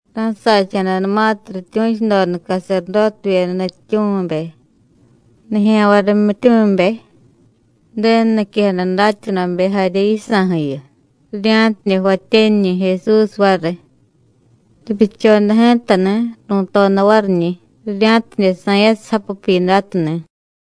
Ra̱sacha̱danumatiy rityu̱chudoda caserdótevyeda nutyityu̱mibe, nijya̱nvay rimyityumibe, Ju̱denu niquejada datyanuvabe jarye yisa̱ju̱yu, rirya̱tidye jvatyaniñi̱ Jesús variy. Ripyuchoda ji̱tani̱, ru̱toda variñi̱ rirya̱tidye sa̱yasiy japu Pyidátu ni̱.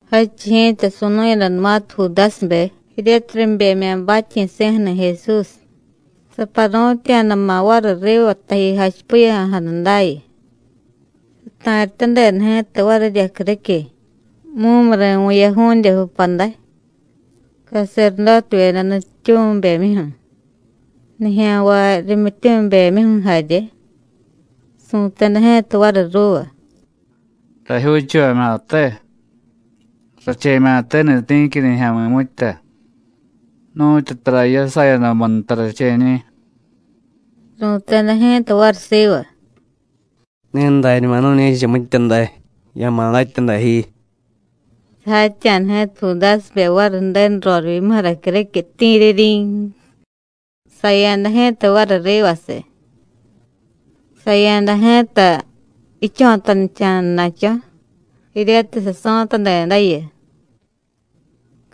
Jadchiy ji̱ta su̱nu̱yadanumatiy Judásibe jiryatiy ribemya̱ batyi̱si̱ju̱ni̱ Jesús, saparu̱tya̱dama̱ variy riva taji jachipiya̱jada dayu. Sata̱ryatadeda ji̱ta varirya criquiy, mumuri̱ vu̱yaju̱dye pupaday, caserdótevyeda nutyityu̱mibemyuju̱, nijya̱nvay rimyityumibemyuju̱ jarye. Su̱teda ji̱ta variy ruuva: “¡Rajyuuchuvamya̱te! Rache̱mya̱teni̱ ti̱qui nijya̱mi̱ mitya. Nu̱tyu tara jiyasayadamu nta rache̱ñi̱.” Ru̱teda ji̱ta variy siva: “Ne dañuma nu̱ñe̱cha mitya day. Ya̱ma̱ datya day ji.” Sajatya̱da ji̱ta Judásibe variy Ju̱denu rorivyimuju̱ra criquiy, ¡ti̱ri̱ryin! saya̱da ji̱ta variy rivasiy. Saya̱da ji̱ta jicho̱tanicha̱dana̱cho̱, jiryatiy saso̱tadedayu.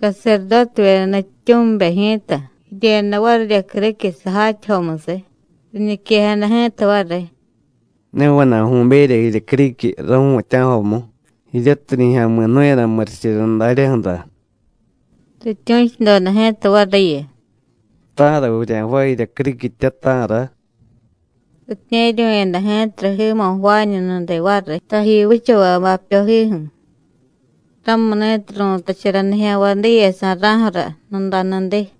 Caserdótevyeda nutyityu̱mibe ji̱ta jiryeda varirya criquiy sajatyajomusiy, riñiquejada ji̱ta variy: “Ne vana̱y vu̱berya jirya criquiy ru̱mutya̱jomu, jiryatiy nijya̱mi̱ jnu̱yada murichirya daryaju̱ra.” Rityu̱chudoda ji̱ta variyu: “¿Ta̱ra vurya̱jvaay jirya criquitya, ta̱ra?” Ritye̱ryu̱yada ji̱tara jiimo̱ jvaañu nudiy variy, taji vichavay bapyojiju̱. Ramuni̱tiy ru̱tachara nijya̱nvay diye sa̱ra̱ju̱ra Nudanudiy.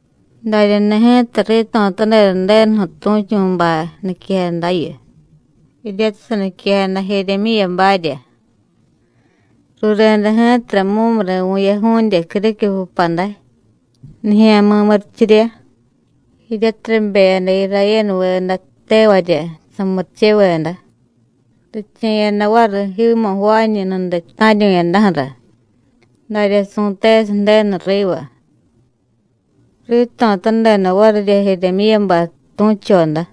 Daryani̱ ji̱ta rito̱tadeda Ju̱denuju̱ tu̱chu̱bay niquejadayu, jiryatiy saniquejada Jiryimyíyabarya: “Rureda ji̱tara mumuri̱ vu̱yaju̱dye criquiy pupaday, nijya̱mi̱ murichirya, jiryatiy ribeyada Irayénuveda tevarya samuricheveda, riche̱yada variy jiimo̱ jvaañu nudiy ta̱ryu̱yadaju̱ra, darya su̱tesiy Ju̱denu riva.” Rito̱tadeda varirya Jiryimyíyabay tu̱choda.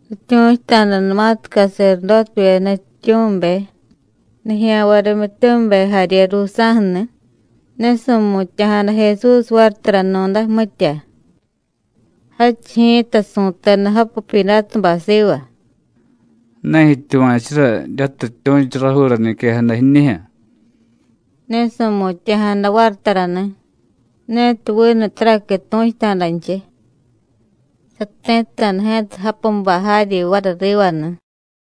Rityu̱chuta̱danumatiy caserdótevyeda nutyityu̱mibe, nijya̱nvay rimyityumibe jarye ruusa̱ju̱ni̱, ne su̱mutya̱jada Jesús variy taranu̱day, mitya. Jadchiy ji̱ta su̱teda japu Pyidátubay siva: “¿Ne jityuva̱chura jiryatiy rityu̱chu rajuura niquejada jiñijyu̱?” Ne su̱mutya̱jada variy tarani̱, netiy vinu taraqui tu̱chuta̱danchiy. Sati̱tta̱da ji̱ta japubay jaryi variy rivani̱.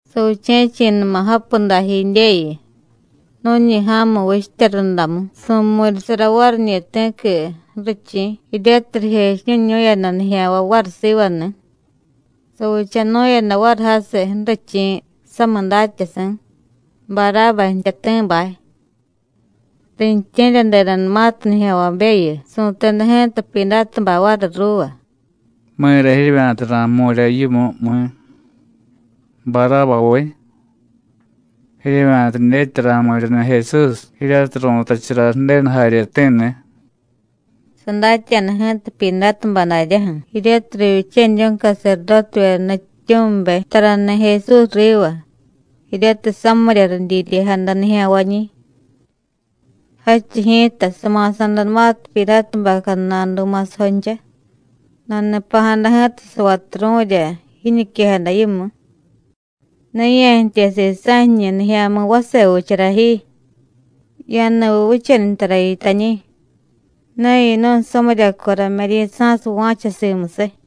Saviche̱chi̱numa japu dajidyeyu, nu̱ñi ja̱mu vichtya rundamu, su̱mu̱ryasara variñi̱ ti̱qui ju̱richi̱ jiryatiy rijechiñu̱ñu̱yada nijya̱nvay variy sivani̱. Savichanu̱yada variy jasiy ju̱richi̱ samiy datyasi̱, Barába jtyati̱bay. Riintye̱ryadedanumatiy nijya̱nvabeyu, su̱teda ji̱ta Pyidátubay variy ruuva: “¿Mi̱ra jiryevya̱ta ra̱jmu̱rya yimu, mi̱? Barábaviy. ¿Jiryevya̱ta dyetya ra̱jmu̱ryani̱ Jesús, jiryatiy ru̱tachara Ju̱denu jaryeti̱ni̱?” Sadatya̱da ji̱ta Pyidátubay daryaju̱ jiryatiy rivyichaniryu̱y caserdótevyeda nutyityu̱mibe tarani̱ Jesús riva, jiryatiy samirya ridyiryejada nijya̱nvañi̱. Jadchiy ji̱ta sama̱sa̱danumatiy Pyidátubay cadnadu ma̱sajoncha, nani̱pa̱jada ji̱ta savaturu̱rya jiñiquejada yimu: “Ne ya̱jtye sisa̱ jiñu nijya̱mi̱ vase vichara ji, ya̱ni̱viy vichaniy tara yitañi̱, ne yinu̱y samiryaco rame̱ryi̱sa̱siy va̱cha simusiy.”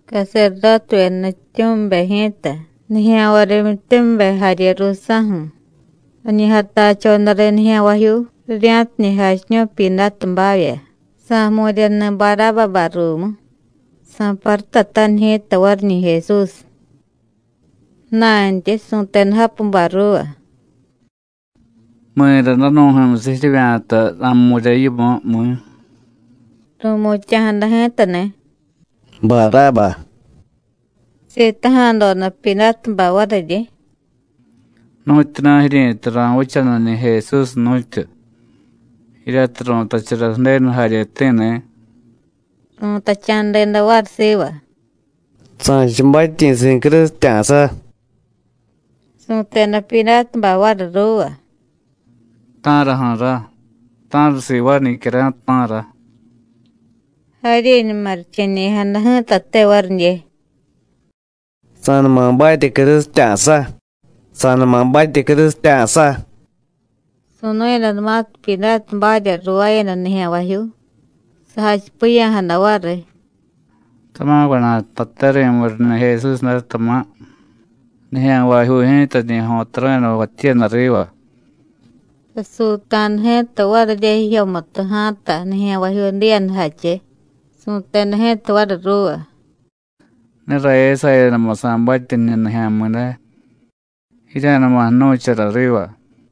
Caserdótevyeda nutyityu̱mibe ji̱ta, nijya̱nvay rimyityumibe jarye ruusa̱ju̱ rañi jatachoda riy nijya̱nvajyuu, rirya̱tidye jachiñu̱y Pyidátubavya sa̱jmu̱ryani̱ Barábabay ruumu, sa̱parutataniy ji̱ta variñi̱ Jesús. Ju̱na̱ntyi su̱teda japubay ruuva: “¿Mi̱ra danu̱ju̱myusiy jiryevya̱ta ra̱jmu̱rya yimu, mi̱?” Ru̱mutya̱jada ji̱tani̱: “¡Barába!” Sitaja̱doda Pyidátubay variryi: “¿Nu̱tyuna̱ jiryi̱tay ra̱vichaniñi̱ Jesús, nu̱tyu? jiryatiy ru̱tachara Ju̱denu jaryeti̱ni̱.” Ru̱tacha̱deda variy siva: “¡Sa̱cha batyi̱si̱ crusitya̱sa!” Su̱teda Pyidátubay variy ruuva: “¿Ta̱raju̱ra? ¿Ta̱ra sivaay nicyara̱y, ta̱ra?” Jaryiñuma riche̱ñe̱ya̱jada ji̱tate varidye: “¡Sa̱numa batye crusitya̱sa! ¡Sa̱numa batye crusitya̱sa!” Su̱nu̱yadanumatiy Pyidátubarya ruuvaayada nijya̱nvajyuu, sajachipiya̱jada variy: “Tama̱ vana̱y jtate ri̱mu̱ryani̱ Jesús day, tama̱, nijya̱nvajyuu ji̱ta rañi jo̱taru̱yada jvatyiyada riva.” Sasuuta̱da ji̱ta varirya jijyomutu ja̱a̱ta nijya̱nvajyuu diyadajache, su̱teda ji̱ta variy ruuva: “Ne rayasayadamu sa̱batye jiñu nijya̱mi̱ day. Jirya̱numa jnu̱chara riva.”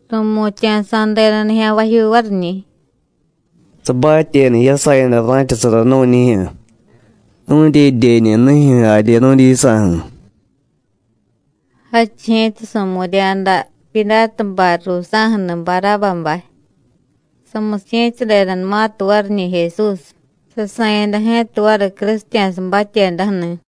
Ru̱mutya̱sa̱deda nijya̱nvajyuu variñi̱: “¡Sabatyeda jiyasayada ra̱chasara nu̱ñijyu̱, nu̱dyedyeñunijyu̱ jarye nu̱dyisa̱ju̱!” Jadchiy ji̱ta su̱mu̱rya̱da Pyidátubay ruusa̱ju̱ni̱ Barábabay. Samusiye̱tyadedanumatiy variñi̱ Jesús, sasa̱yada ji̱ta variy crusitya̱sa batyedaju̱ni̱.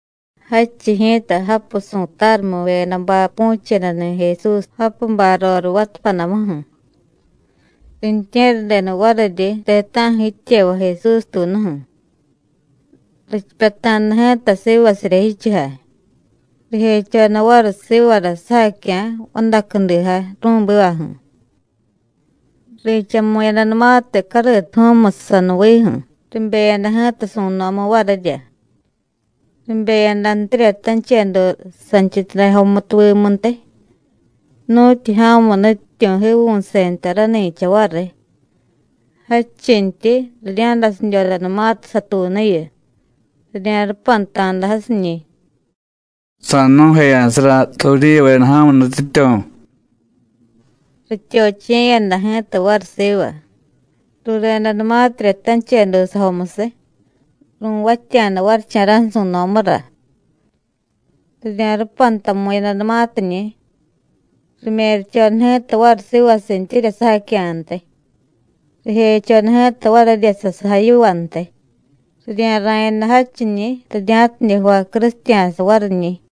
Jadchiy ji̱ta japu su̱tarumivyedabay pu̱chedani̱ Jesús japubay roriy vatapadamuju̱, riintye̱ryadeda variryi ti̱ta̱ju̱ jityevay Jesús tuunuju̱. Richipyata̱da ji̱ta sivasirya jichujay, rijechoda variy sivara sujacya̱ vadacudijay ru̱bivaju̱. Richamu̱yadanumatiy cariituju̱u̱musiy sanuviiju̱, ribeyada ji̱ta su̱no̱mu varirya. Ribeyadantirya tanchedu santyityuday jomutuvimuntiy nu̱tyu ja̱mu nutyityu̱ jiivu̱se nta rani̱cha variy. Jadchintyi rirya̱dasidyodanumatiy satuunuyu, rirya̱rupanta̱da jasiñi̱: “¡Sa̱jnu̱jeya̱sara Judíyuveda ja̱mu nutyityu̱!” Rityochiye̱yada ji̱ta variy siva, ruredanumatirya tanchedu sajomusiy, ru̱vatya̱da varicha̱ra̱ju̱ su̱no̱mura. Rirya̱rupantamu̱yadanumatiñi̱, rimerchoda ji̱ta variy sivasintyirya sujacya̱ntiy, rijechoda ji̱ta varirya sasujay yivantiy, rirya̱ra̱yada jadchiñi̱ rirya̱tidye jvay crusitya̱sa variñi̱.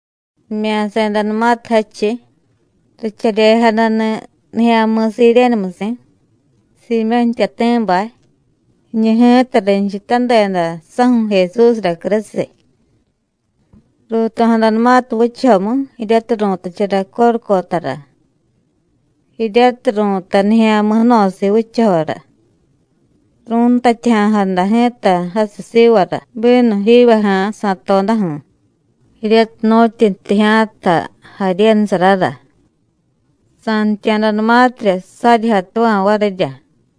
Rimya̱sedanumatiy jadchiy, richaryejadani̱ nijya̱mi̱ Sirénemusi̱, Siimyó̱ jtyati̱bay. Jiñu ji̱ta rinchutadeda saju̱ Jesúsra crusiy. Ruuto̱jadanumatiy vichajomu jiryatiy ru̱tachara Córucotara (jiryatiy ru̱tay Nijya̱mi̱ Jno̱siiy Vichajora), ru̱ntatyaja̱jada ji̱ta jasiy sivara bínu jivyaja̱a̱ sa̱todaju̱, jiryatiy nu̱tyi jtijya̱ta jaryenusarara. Sa̱ntya̱danumatirya, saryi jatuva̱ varirya.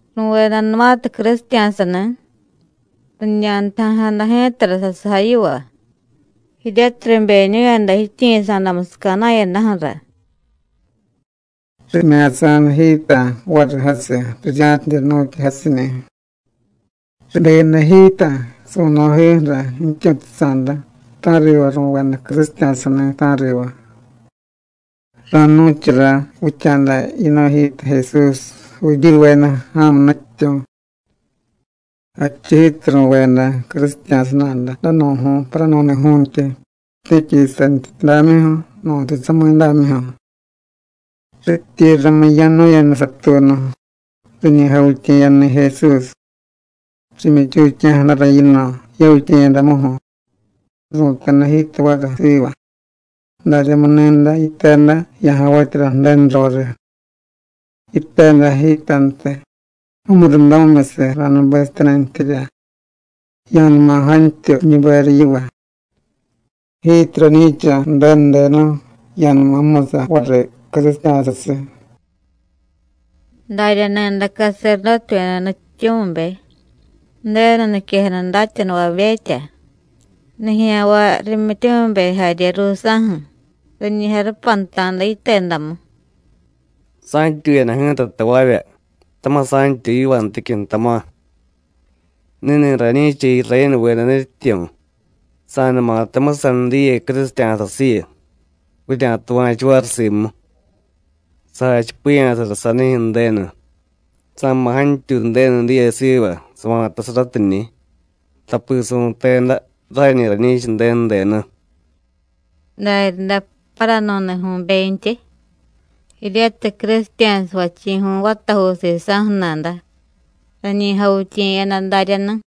Ru̱vedanumatiy crusitya̱sani̱, riñantaja̱jada ji̱tara sasujay yiva, jiryatiy ribeñu̱yada jityiyi̱sa̱damusiy ca̱na̱yadaju̱ra. Rimya̱sa̱da ji̱ta variy jasiy, rirya̱tidye jnu̱tya jasiñi̱. Ribeyada ji̱ta su̱no̱ jiyuju̱ra jityu̱chutasa̱da, ta̱riva ru̱veda crusitya̱sani̱, ta̱riva. Ranu̱chara vicha̱da: “Jiñu ji̱ta Jesús, Judíyuveda ja̱mu nutyityu̱.” Jadchiy ji̱ta ru̱veda crusitya̱sa nada danu̱ju̱y paranu̱ni̱ju̱ntyi, ti̱qui santyityudamyuju̱, nu̱ntiy samidámyuju̱. Rityi ramiya̱nu̱yada satuunu, riñi javityiye̱yadani̱ Jesús, rimyichutyaja̱jadara yino̱ yavityiye̱yadamuju̱, ru̱teda ji̱ta variy siva: “Daryamu ni̱day yiteda ya̱javatyara Ju̱denu roriy, yiteda ji̱tantiy mumurundamimyusiy ra̱nubesityanintyirya, ya̱numa jantyuy jiñuberiy yiva. Jiityi rañi̱cha Ju̱denu denu, ya̱numa jmusa variy crusitya̱sasiy.” Darya ni̱day caserdótevyeda nutyityu̱mibe, Ju̱denu niquejada datyanuvabetya, nijya̱nvay rimyityumibe jarye ruusa̱ju̱ riñi jarupanta̱da yitedamu: “Sa̱ntyuyada ji̱ta tavavya, tama̱ sa̱ntyuy yivanticyu̱, tama̱. Ni̱ni̱ rañi̱cha Irayénuveda nutyityu̱, sa̱numata jmusaniy diye crusitya̱sasiyu, vurya̱tuva̱chu variy simu. Sajachipiya̱sara sanijyu̱ Ju̱denu. Sa̱ma̱ jantyuy Ju̱denu diye siva sava̱tasaratiñi̱, tapi su̱teda: Rañi rañi̱cha Ju̱denu denu.” Daryaday paranu̱ni̱ju̱bentyi, jiryatiy crusitya̱sa jvachi̱ju̱y vatajuu sisa̱ju̱ nada, rañi javityiye̱yada daryani̱.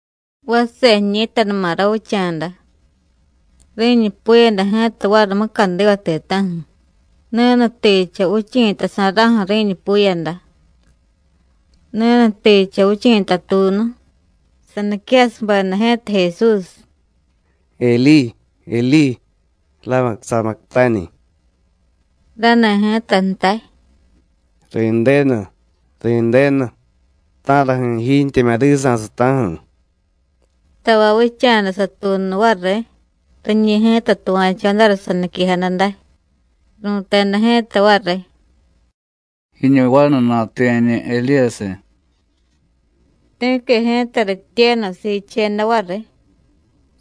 Vase jiñi̱tanuma ravicha̱da, ri̱ñupuyada ji̱ta variy mucadiva ti̱ta̱ju̱, ni̱nutijcha vichi̱tasa̱ra̱ju̱ ri̱ñupuyada. Ni̱nutijcha vichi̱ta tuunu, saniquejasubeda ji̱ta Jesús: “Elí, Elí, láma sabactáni.” Rani̱ ji̱ta jtay: “Ri̱ndenu, Ri̱ndenu, ¿ta̱raju̱ jijiintyemya̱ risa̱siy, ta̱raju̱?” Tavay vicha̱da satuunu variy, riñi̱ ji̱ta tuva̱chodara saniquejada day, ru̱teda ji̱ta variy: “Jiñu vanu natuye̱ñi̱ Edíyasiy.” Ti̱qui ji̱ta rityenu siicheda variy,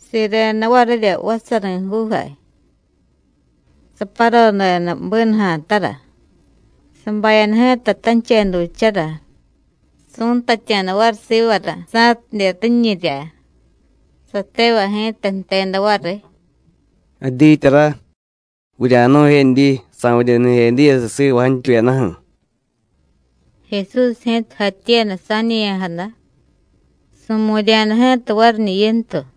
sireda varirya vatsari̱juujay, saparodeda bínuja̱tara, sabayada ji̱ta tanchedujchara, su̱ntatya̱da variy sivara, sa̱tidye riñirya. Satevay ji̱ta jteda variy: “Jadyityara, vurya̱jnu̱jedyi sa̱vidye jniy Edíyasiy siva jantyuyadaju̱.” Jesús ji̱ta jatyiyada sa̱ñe̱ya̱jada, su̱mu̱rya̱da ji̱ta variñi̱ yintu.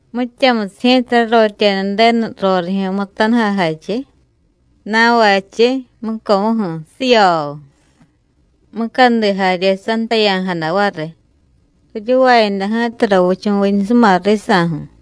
Mityamusiy ji̱ta rarotyeda Ju̱denu rorijyu̱ mutanujay jache, na̱vachiy mucomuju̱, ¡siyooo! mucadi jarye santaya̱jada variy, riryuvayada ji̱ta ravichu̱viñusuma risa̱ju̱.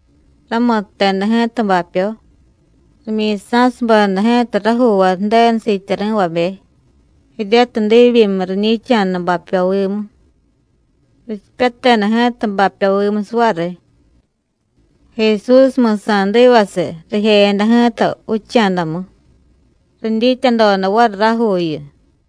Ramutteda ji̱ta bapyo, rimyi̱sa̱subeda ji̱ta rajuuvay Ju̱denu siityari̱vabe, jiryatiy diibyimiy riñi̱cha̱da bapyovimu. Richipyateda ji̱ta bapyovimusiy variy. Jesús mi̱sa̱divasiy, rijeyada ji̱ta vicha̱damu, ridyityadoda variy rajuuyu.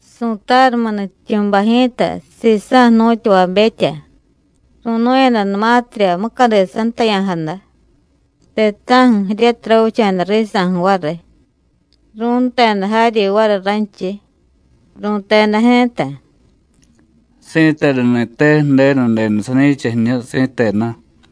Su̱tarumiy nutyityu̱bay ji̱ta, sisa̱ jnu̱tyavabetya, ru̱nu̱yadanumatirya mucadi santaya̱jada, ti̱ta̱ju̱ jiryatiy ravicha̱da risa̱ju̱ variy, ru̱nteda jaryi variy ranchiy, ru̱teda ji̱ta: “¡Si̱tenuni̱te Ju̱denu denu sani̱cha jiñu, si̱tenu!”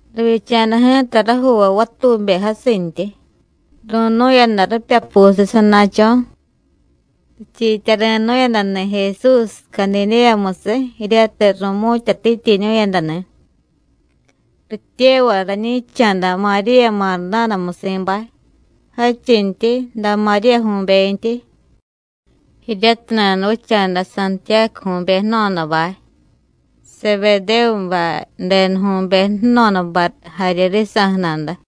Rivyicha̱da ji̱ta rajuuvay vatube jasintyi, ru̱nu̱yada ripyapusiy sana̱cho̱. Richiityari̱nu̱yadani̱ Jesús Cadidéyamusiy jiryatiy ru̱mu̱tyatityiñu̱yadani̱. Rityevay rañi̱cha̱da Maríya Mardánamusi̱bay, jadchintyi da Maríyaju̱bentyi, jiryatiy nanuvicha̱da Santiyácuju̱be jno̱dabay, Sebedévubay denuju̱be jno̱dabay jarye risa̱ju̱ nada.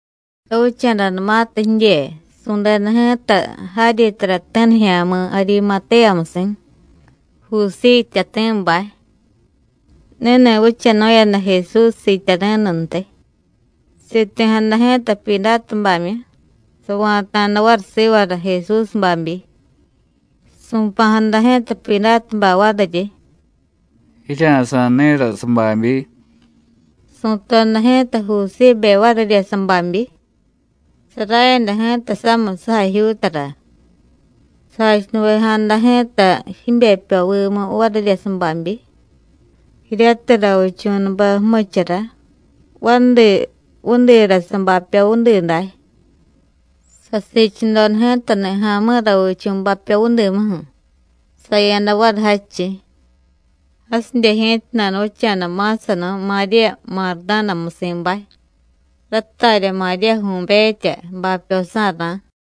Ravicha̱danumatiy jidye, su̱deda ji̱ta jaryi tarati̱ nijya̱mi̱ Arimatéyamusi̱, Jusíy jtyati̱bay. Ni̱ni̱ vichanu̱yada Jesús siityari̱nuntiy. Siti̱jada ji̱ta Pyidátubamyu, sava̱ta̱da variy sivara Jesús babyi. Su̱pa̱jada ji̱ta Pyidátubay variryi: “Jirya̱sa̱y ni̱ra sababyi.” Su̱toda ji̱ta Jusíbe varirya sababyi, sarayada ji̱ta samiy sujajyuutara. Sajachunuvejada ji̱ta jibepyovimu varirya sababyi, jiryatiy ravichu̱nube jmuchura vadi vudira sabapyo vudi day. Sasiichudoda ji̱tani̱ ja̱mi̱ ravichu̱ bapyo vudimuju̱, saya̱da variy jadchiy. Jasidye ji̱ta nanuvicha̱da ma̱sanu̱y Maríya Mardánamusi̱bay, ratarya Maríyaju̱betya, bapyosá̱rá̱.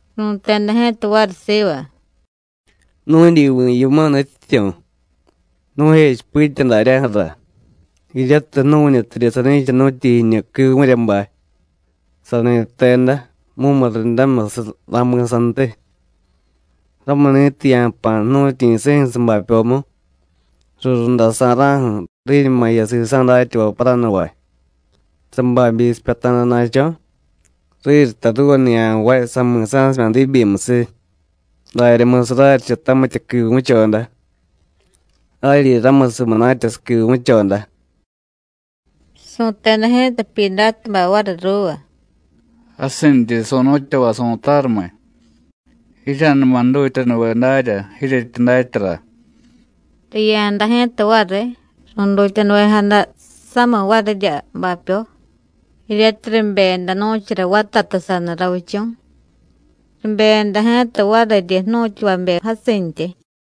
Ru̱teda ji̱ta variy siva: “Nu̱dyivi̱ yimu, Nutyityu̱, nu̱jechipitya daryaju̱ra jiryatiy jnu̱ñutidye sani̱chanu̱tyi jiñu quivu̱ryabay, sani jteda: Mumurundamimyusiy ra̱mi̱santiy. Ramuni̱tiy ya̱jpa̱ jnu̱tyi̱si̱ju̱ sabapyomu, rurundasa̱ra̱ju̱, riñuma jiya sisa̱ datyavay paranuvay, sababyi sipyata̱dana̱cho̱, riryi jtay ruuva nijya̱nvay: Sami̱sa̱simya̱ diibyimusiy. Daryamusiy raryicha tamitya quivu̱choda, jaryi ramusiy munatya saquivu̱choda.” Su̱teda ji̱ta Pyidátubay variy ruuva: “Jasinryi su̱nu̱tyavay su̱tarumiy, jirya̱numa jdutyanuve darya jiryetyi datyara.” Riya̱da ji̱ta variy, ru̱dutyanuvejada samiy varirya bapyo, jiryatiy ribeyada nu̱chara vatatu saniy ravichu̱, ribeyada ji̱ta variryi jnu̱tyavabe jasintyi.